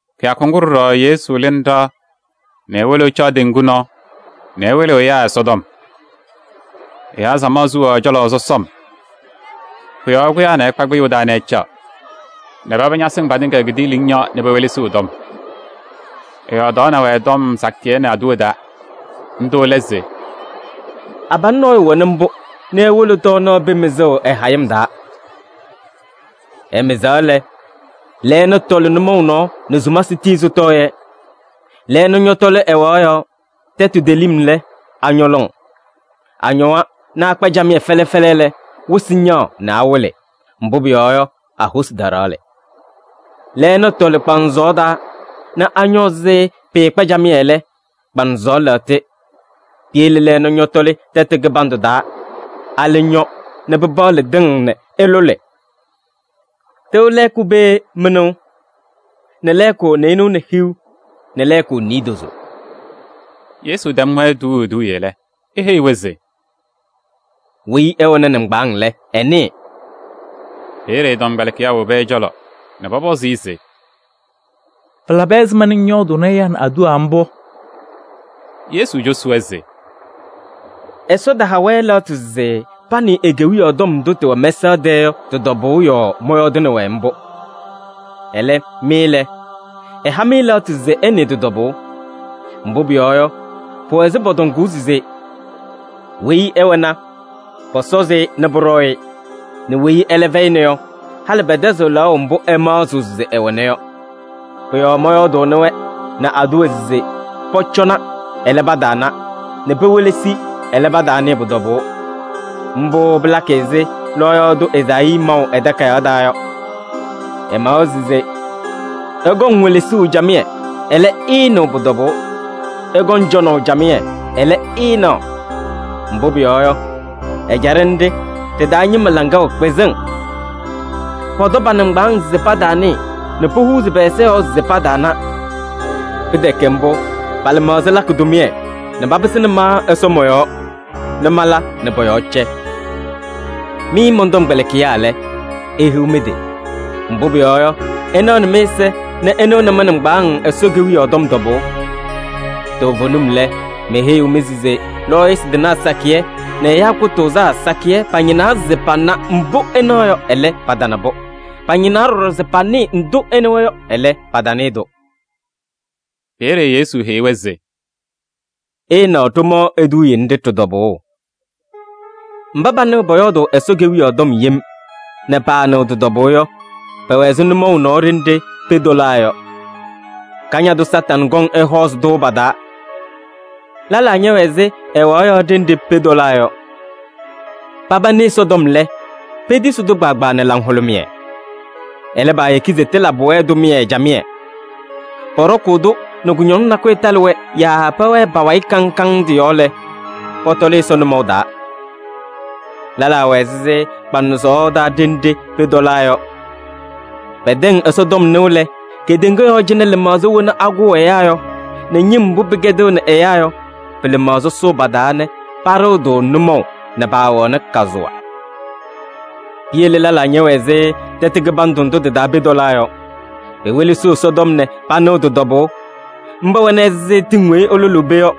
Kɩyakʋ ŋgʋ ɖɔɖɔ Yesu lɩnɩ ɖɩɣa nɛ ewolo ɛcaɣ teŋgu nɔɔ nɛ ɛwɩlɩɣ ɛyaa Ɛsɔtɔm. Ɛyaa samaɣ suwaɣ ɛ-cɔlɔ sɔsɔm. Pʋ-yɔɔ ɛkʋyaa ɛkpa kpɩyʋʋ taa nɛ ɛcaɣ nɛ paba ñasɩŋ patɩŋa kidiiliŋ yɔɔ nɛ pewelesiɣ ɛ-tɔm. Ɛyɔɔdaɣnɩ-wɛ tɔm sakɩyɛ nɛ aduwa taa. Ndʋ lɛ se: “Abalʋ nɔɔyʋ wɛnɩ mbʋ nɛ ewolo tɔɔnaɣ pee mɩzʋʋ ɛ-hayɩm taa. Ɛmɩzaɣ lɛ, lɛɛna tɔlɩ nʋmɔʋ nɔɔ nɛ sumasɩ tii sɩtɔɔ-yɛ. Lɛɛna ñɔtɔlɩ ɛwaɣ yɔɔ. Tɛtʋ telim lɛ, añɔ lɔŋ. Añɔwa nɛ akpa camɩyɛ fɛlɛ fɛlɛ lɛ, wɩsɩ ñaɣ nɛ awɩlɩ, mbʋ pʋyɔɔ yɔ, a-hosi taɖaɣlɩ. Lɛɛna tɔlɩ kpaŋsɔɔ taa nɛ añɔ ɛzɩ pɩɩkpa camɩyɛ lɛ, kpaŋsɔɔ lɛɣtɩ. Piyele lɛɛna ñɔtɔlɩ tɛtʋ kɩbandʋ taa, alɛ ñɔ nɛ pɩpaɣlɩ tɩŋ nɛ ɩlʋlɩ. Tɩʋ lɛɛkʋ pee mɩnʋʋ nɛ lɛɛkʋ nɩɩnʋwa nɛ hiu nɛ lɛɛkʋ niidozo.” Yesu tɛm-wɛ tuuu eduuye lɛ, eheyi-wɛ se: “Weyi ɛwɛnɩ nɩŋgbaaŋ lɛ, ɛnɩɩ.” Peeye ɛ-tɔmkpɛlɩkɩyaa wobi ɛ-cɔlɔ nɛ pɔpɔzɩ-ɩ se: “Pɩlabɩ ɛzɩma ŋyɔɔdʋʋnɩ ɛyaa nɛ aduwa mbʋ?” Yesu cosi-wɛ se: “Ɛsɔ taha-wɛ lɛɣtʋ se panɩɩ e-Kewiyaɣ tɔm ndʋ tɩwɛ mɛsaɣ tɛɛ yɔ, tɩ-tɔbʋʋ yɔɔ mɔyɔɔdʋʋnɩ-wɛ mbʋ. Ɛlɛ, mɩ lɛ, ɛha-mɩ lɛɣtʋ se ɩnɩɩ tɩ-tɔbʋʋ. Mbʋ pʋyɔɔ yɔ, pʋwɛ ɛzɩ pɔtɔŋʋʋ se: ‘Weyi ɛwɛna, pɔsɔzɩ-ɩ nɛ pʋɖɔɔ-ɩ nɛ weyi ɛlɛ fɛyɩna yɔ, halɩ pɛtɛzɩɣ lɛɣʋ mbʋ ɛmaɣzɩɣ se ɛwɛna yɔ.’ Pʋ-yɔɔ mɔyɔɔdʋʋnɩ-wɛ nɛ aduwa se pɔcɔna, ɛlɛ, pataana, nɛ pewelesi, ɛlɛ, pataanɩɩ pʋ-tɔbʋʋ. Mbʋ pɩlakɩ ɛzɩ lɔɔyaɣ tʋ Ezaayii maʋ ɛ-takayaɣ taa yɔ. Ɛmawa se: ‘Ɩkɔŋ welesuu camɩyɛ, ɛlɛ, ɩɩnɩɣ pʋ-tɔbʋʋ. Ɩkɔŋ cɔnaʋ camɩyɛ, ɛlɛ, ɩɩnaɣ. Mbʋ pʋyɔɔ yɔ, ɛjaɖɛ ndɩ ɖɩ-taa ñɩma laŋa wɛ kpɩzɩŋ. Pɔtɔ pa-nɩŋgbaaŋ se pataanɩɩ, nɛ pohuuzi pɛ-ɛza yɔɔ se pataana. Pɩtɛkɛ mbʋ, pa-lɩmaɣza lakɩ tʋmɩyɛ nɛ papɩsɩnɩ ma Ɛsɔ mɔ-yɔɔ nɛ mala nɛ pɔ-yɔɔ cɛ.’ Mɩ mɔn-tɔmkpɛlɩkɩyaa lɛ, ihiɣ mɩ-tɩ! Mbʋ pʋyɔɔ yɔ, ɩnaɣnɩ mɩ-ɛza nɛ ɩnɩɣnɩ mɩ-nɩŋgbaaŋ Ɛsɔ Kewiyaɣ tɔm tɔbʋʋ. Toovenim lɛ, meheyiɣ-mɩ se lɔɔyɩsɩ tɩnaa sakɩyɛ nɛ ɛyaa kʋtʋʋzaa sakɩyɛ pañɩnaa se pana mbʋ ɩnaɣ yɔ, ɛlɛ, patana-pʋ. Pañɩnaa ɖɔɖɔ se panɩɩ ndʋ ɩnɩwa yɔ, ɛlɛ, patanɩɩ-tʋ.” Peeye Yesu heyi-wɛ se: “Ɩɩnaɣ ɖomaɣ eduuye nɖɩ ɖɩ-tɔbʋʋ: mba panɩɣ pɔyɔɔdʋʋ Ɛsɔ Kewiyaɣ tɔm yem nɛ paanɩɣ tɩ-tɔbʋʋ yɔ, pɛwɛ ɛzɩ nʋmɔʋ nɔɔ ɖenɖe pee tɔlaa yɔ. Kañadʋ Satanɩ kɔŋ ɛhɔɔzɩ-tʋ pa-taa. Lɛlaa ñɛwɛ ɛzɩ ɛwaɣ yɔɔ ɖenɖe pee tɔlaa yɔ. Paba nɩ Ɛsɔtɔm lɛ, petisi-tʋ kpaagbaa nɛ laŋhʋlʋmɩyɛ. Ɛlɛ, paayeki se tɩlabɩ-wɛ tʋmɩyɛ camɩyɛ. Pɔɖɔkʋʋ-tʋ nɛ kʋñɔŋ nakʋyʋ talɩ-wɛ yaa pɛwɛɛ pa-wayɩ kaŋ kaŋ tɩ-yɔɔ lɛ, pɔtɔlɩ Ɛsɔ nʋmɔʋ taa. Lɛlaa wɛ ɛzɩ kpaŋsɔɔ taa ɖenɖe pee tɔlaa yɔ. Pɛtɛŋ Ɛsɔtɔm nɩʋ lɛ, kedeŋa yɔɔ cɩnɛ lɩmaɣza wena akʋʋ ɛyaa yɔ nɛ ñɩm mbʋ pɩkɛdɩɣnɩ ɛyaa yɔ, pɩ-lɩmaɣza sʋʋ pa-taa nɛ paɖɩɣ-tʋ nʋmɔʋ nɛ paawɛɣnɩ kazʋwa. Piyele lɛlaa ñɛwɛ ɛzɩ tɛtʋ kɩbandʋ ndʋ tɩ-taa pee tɔlaa yɔ. Pewelesiɣ Ɛsɔtɔm nɛ panɩɣ tɩ-tɔbʋʋ. Mba wɛnɩ ɛzɩ tɩŋ weyi ɩlʋlɩ pee yɔ: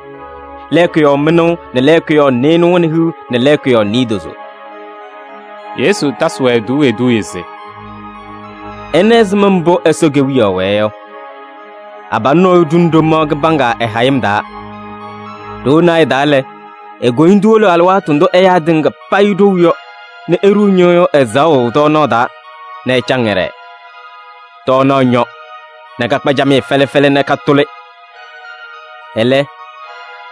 lɛɛkʋ yɔɔ mɩnʋʋ nɛ lɛɛkʋ yɔɔ nɩɩnʋwa nɛ hiu nɛ lɛɛkʋ yɔɔ niidozo.” Yesu tasɩ-wɛ tuuu eduuye se: “Ɩna ɛzɩma mbʋ Ɛsɔ Kewiyaɣ wɛɛ yɔ: abalʋ nɔɔyʋ ɖuni ɖomaɣ kɩbaŋga ɛ-hayɩm taa. Ɖoo naayɛ taa lɛ, e-koyindu wolo alɩwaatʋ ndʋ ɛyaa tɩŋa payɩ ɖou yɔ nɛ eɖuu ñɩyʋʋ ɛzaɣʋ tɔɔnaɣ taa nɛ ɛcaŋ ɛɖɛɛ. Tɔɔnaɣ ñɔ nɛ kakpa camɩyɛ fɛlɛ fɛlɛ nɛ katʋlɩ. Ɛlɛ,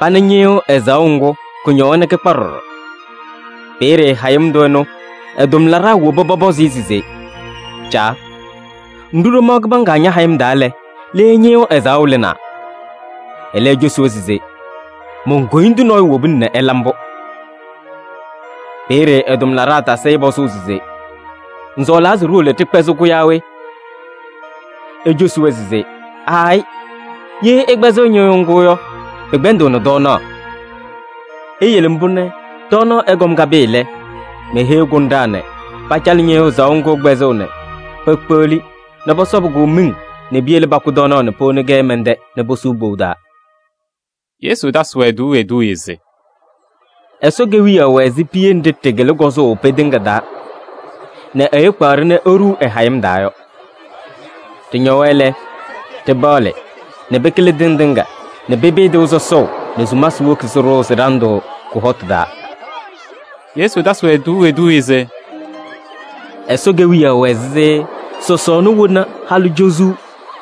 pana ñɩyʋʋ ɛzaɣʋ ŋgʋ, kʋñɔwa nɛ kɩkpa ɖɔɖɔ. Peeye hayɩm tʋ ɛnʋ ɛ-tʋmlaɖaa woba pɔpɔzɩ-ɩ se: ‘Caa! Ŋɖu ɖomaɣ kɩbaŋga ña-hayɩm taa lɛ, le ñɩyʋʋ ɛzaɣʋ lɩnaa?’ Ɛlɛ ecosi-wɛ se: ‘Mon-koyindu nɔɔyʋ wobina nɛ ɛla mbʋ.’ Peeye ɛ-tʋmlaɖaa tasɩ-ɩ pɔzʋʋ se: ‘Ŋsɔɔlaa se ɖiwolo ɖɩkpɛzɩ-kʋ yaa we?’ Ecosi-wɛ se: ‘Aayɩ! Ye ɩkpɛzɩɣ ñɩyʋʋ ŋgʋ yɔ, pɩkpɛndɩɣnɩ tɔɔnaɣ. Iyele mbʋ nɛ tɔɔnaɣ ɛkɔm kapɩɩ lɛ, meheyi kʋnɖaa nɛ pacalɩ ñɩyʋʋ ɛzaɣʋ ŋgʋ kpɛzʋʋ nɛ pekpeɣli nɛ pɔsɔbɩ-kʋ miŋ nɛ piyele pakʋ tɔɔnaɣ nɛ powoni-kɛ mɛn-tɛ nɛ posuu kpou taa.’” Yesu tasɩ-wɛ tuuu eduuye se: “Ɛsɔ Kewiyaɣ wɛ ɛzɩ piye nɖɩ ɖɩkɩlɩ kɔzʋʋ pee tɩŋa taa nɛ ɛyʋ kpaɣ-ɖɩ nɛ eɖuu ɛ-hayɩm taa yɔ. Ɖɩñɔwa lɛ, ɖɩpaɣlɩ nɛ pɩkɩlɩ tɩŋ tɩŋa nɛ pɩpɩɩ tɩʋ sɔsɔʋ nɛ sumasɩ woki sɩɖʋʋ sɩ-ɖandʋ kʋ-hɔtʋ taa.” Yesu tasɩ-wɛ tuuu eduuye se: “Ɛsɔ Kewiyaɣ wɛ ɛzɩ sɔsɔɔna wena halʋ cozuu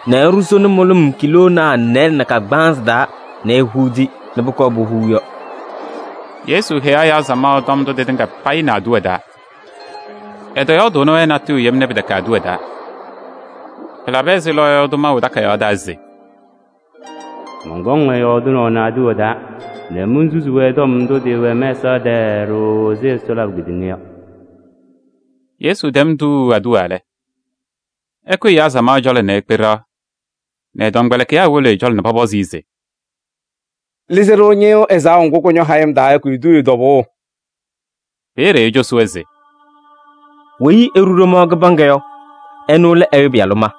nɛ ɛɖʋ sona mʋlʋm kiiloonaa nɩɩlɛ nɛ kagbaanzɩ taa nɛ ehuudi nɛ pʋkɔɔ puhuu yɔ.” Yesu heyaɣ ɛyaa samaɣ tɔm ndʋ tɩtɩŋa payɩ nɛ aduwa taa. Ɛtɔyɔɔdʋʋnɩ-wɛ natʋyʋ yem nɛ pɩtɛkɛnɩ aduwa taa. Pɩlabɩ ɛzɩ lɔɔyaɣ tʋ maʋ ɛ-takayaɣ taa se: “Mɔnkɔŋ-wɛ yɔɔdɩnaʋ nɛ aduwa taa nɛ monsusi-wɛ tɔm ndʋ tɩwɛ mɛsaɣ tɛɛ ɖooo ɛzɩ Ɛsɔ labʋ kedeŋa yɔ.” Yesu tɛm tuuu aduwa lɛ, ɛkʋyɩ ɛyaa samaɣ cɔlɔ nɛ ekpe ɖɩɣa nɛ ɛ-tɔmkpɛlɩkɩyaa wolo ɛ-cɔlɔ nɛ pɔpɔzɩ-ɩ se: “Lɩzɩ-ɖʋ ñɩyʋʋ ɛzaɣʋ ŋgʋ kʋñɔ hayɩm taa yɔ ki-eduuye tɔbʋʋ.” Peeye ecosi-wɛ se: “Weyi eɖu ɖomaɣ kɩbaŋga yɔ, ɛnʋ lɛ Ɛyʋ Pɩyalʋ ma.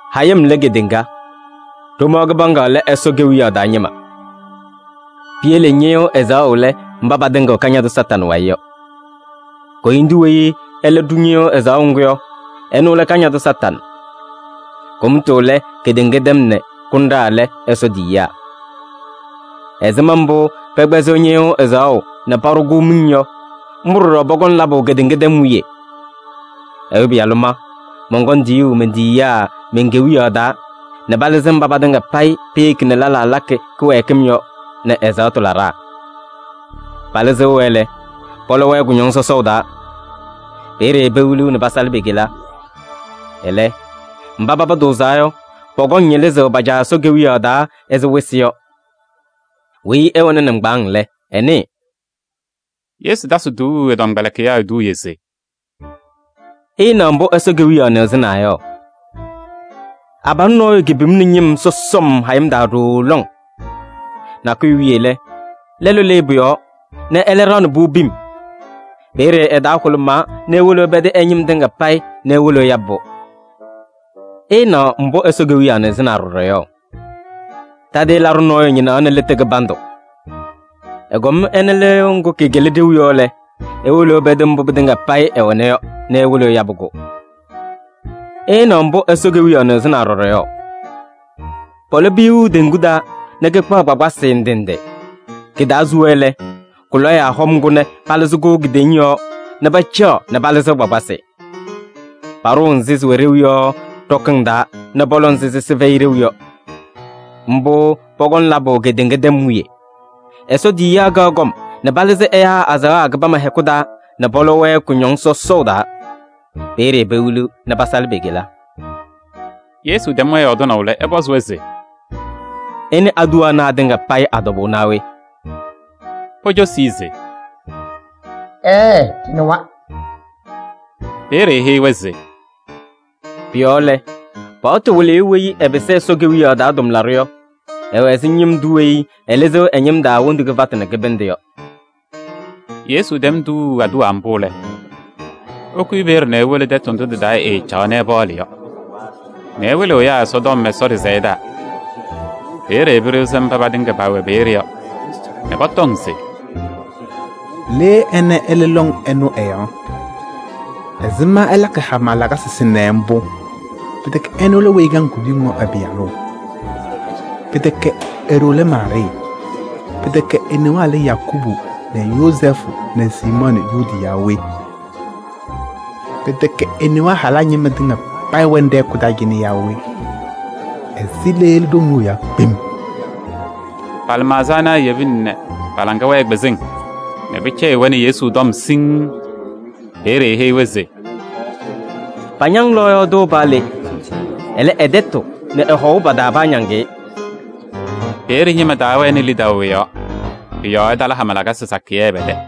Hayɩm lɛ kedeŋa. Ɖomaɣ kɩbaŋga lɛ Ɛsɔ Kewiyaɣ taa ñɩma. Piyele ñɩyʋʋ ɛzaɣʋ lɛ mba patɩŋɩɣ Kañadʋ Satanɩ wayɩ yɔ. Koyindu weyi ɛlɛ ɖu ñɩyʋʋ ɛzaɣʋ ŋgʋ yɔ, ɛnʋ lɛ Kañadʋ Satanɩ. Kʋmtʋ lɛ kedeŋa tɛm nɛ kʋnɖaa lɛ Ɛsɔ tiyiyaa. Ɛzɩma mbʋ pɛkpɛzɩɣ ñɩyʋʋ ɛzaɣʋ nɛ paɖʋ-kʋ miŋ yɔ, mbʋ ɖɔɖɔ pɔkɔŋ labʋ kedeŋa tɛm wiye. Ɛyʋ Pɩyalʋ ma, mɔnkɔŋ tiyuu men-tiyiyaa men-Kewiyaɣ taa nɛ palɩzɩ mba patɩŋa payɩ peyeki nɛ lɛlaa lakɩ kɩwɛɛkɩm yɔ nɛ ɛzaɣtʋ laɖaa. Palɩzɩɣ-wɛ lɛ, pɔlɔ-wɛ kʋñɔŋ sɔsɔʋ taa. Peeye pewiliɣ nɛ pasalɩ pe-kela. Ɛlɛ, mba paba tʋʋzaa yɔ, pɔkɔŋ ñɩlɩzʋʋ pa-Caa Ɛsɔ Kewiyaɣ taa ɛzɩ wɩsɩ yɔ. Weyi ɛwɛnɩ nɩŋgbaaŋ lɛ, ɛnɩɩ!” Yesu tasɩ tuuu ɛ-tɔmkpɛlɩkɩyaa eduuye se: “Ɩɩnaɣ mbʋ Ɛsɔ Kewiyaɣ nɩɣzɩnaa yɔ: abalʋ nɔɔyʋ kepimni ñɩm sɔsɔm hayɩm taa ɖooo lɔŋ. Nakʋyʋ wiye lɛ, lɛlʋ lɩɩ pʋ-yɔɔ nɛ ɛlɛ ɖaɣnɩ-pʋ pim. Peeye ɛ-taa hʋlʋmaa nɛ ewolo ɛpɛdɩ ɛ-ñɩm tɩŋa payɩ nɛ ewolo ɛyabɩ-pʋ.” “Ɩɩnaɣ mbʋ Ɛsɔ Kewiyaɣ nɩɣzɩnaa ɖɔɖɔ yɔ: tadɩyɛ laɖʋ nɔɔyʋ ñɩnaɣnɩ lɩtʋ kɩbandʋ. Ɛkɔm ɛna lɩyʋʋ ŋgʋ kɩkɩlɩ ɖeu yɔ lɛ, ewolo ɛpɛdɩ mbʋ pɩtɩŋa payɩ ɛwɛna yɔ nɛ ewolo ɛyabɩ-kʋ.” “Ɩɩnaɣ mbʋ Ɛsɔ Kewiyaɣ nɩɣzɩnaa ɖɔɖɔ yɔ: pɔlɔ piyuu teŋgu taa nɛ kɩkpaɣ kpakpasɩ ndɩ ndɩ. Kɩ-taa suwa lɛ, kʋ-lɔyaa hɔm-kʋ nɛ palɩzɩ-kʋ kidiiliŋ yɔɔ nɛ pacaɣ nɛ palɩzɩɣ kpakpasɩ. Paɖʋʋ nzɩ sɩwɛ ɖeu yɔ ɖɔkɩŋ taa nɛ pɔlɔ nzɩ sɩsɩ fɛyɩ ɖeu yɔ. Mbʋ pɔkɔŋ labʋ kedeŋa tɛm wiye. Ɛsɔ tiyiyaa kaɣ kɔm nɛ palɩzɩ ɛyaa azaɣa kɩbama hɛkʋ taa nɛ pɔlɔ-wɛ kʋñɔŋ sɔsɔʋ taa. Peeye pewiliɣ nɛ pasalɩ pe-kela.” Yesu tɛm-wɛ yɔɔdɩnaʋ lɛ, ɛpɔzɩ-wɛ se: “Ɩnɩ aduwa ana atɩŋa payɩ a-tɔbʋʋ naa we?” Pocosi-i se: “Ɛɛɛ! Ɖɩnɩwa.” Peeye eheyi-wɛ se: “Pʋ-yɔɔ lɛ, paɣtʋ wɩlɩyʋ weyi ɛpɩsɩ Ɛsɔ Kewiyaɣ taa tʋmlaɖʋ yɔ, ɛwɛ ɛzɩ ñɩm tʋ weyi ɛlɩzɩɣ ɛ-ñɩm taa wondu kɩfatʋ nɛ kɩbɩndʋ yɔ.” Yesu tɛm tuuu aduwa mbʋ lɛ, ɛkʋyɩ peeye nɛ ewolo tɛtʋ ndʋ tɩ-taa ɛɛcaɣaɣ nɛ ɛpaɣlɩ yɔ nɛ ɛwɩlɩɣ ɛyaa Ɛsɔtɔm Ɛsɔ ɖɩsɛyɛ taa. Peeye pɩɖɩɣzɩ mba patɩŋa pɛwɛ peeye yɔ nɛ pɔtɔŋ se: “Le ɛnɛ ɛlɩ lɔŋ ɛnʋ ɛ-yɔɔ? Ɛzɩma ɛlakɩ hama lakasɩ sɩnɛ mbʋ? Pɩtɛkɛ ɛnʋ lɛ weyi ɛkaŋ kuduyiŋ yɔ ɛ-pɩyalʋ? Pɩtɛkɛ e-ɖoo lɛ Maarɩɩ? Pɩtɛkɛ e-newaa lɛ Yakubu nɛ Yozɛɛfʋ nɛ Siimɔɔ nɛ Yuudi yaa we? Pɩtɛkɛ e-newaa halaa ñɩma tɩŋa payɩ wɛnɩ ɖɛ-hɛkʋ taa cɩnɛ yaa we? Ɛzɩ le ɛlɩ ɖoŋ ɛnʋ ɛ-yɔɔ kpem?” Pa-lɩmaɣza ana ayebina nɛ pa-laŋa wɛɛ kpɩzɩŋ nɛ pɩcɛyɩɣ-wɛ nɛ Yesu tɔm siŋŋ. Peeye eheyi-wɛ se: “Pañaŋ lɔɔyaɣ tʋ paa le. Ɛlɛ, ɛ-tɛtʋ nɛ ɛ-hɔʋ pa-taa paañaŋ-ɩ.” Peeye ñɩma taawɛnɩ lidaʋ ɛ-yɔɔ, pʋ-yɔɔ ɛtala hama lakasɩ sakɩyɛ pɛ-tɛ.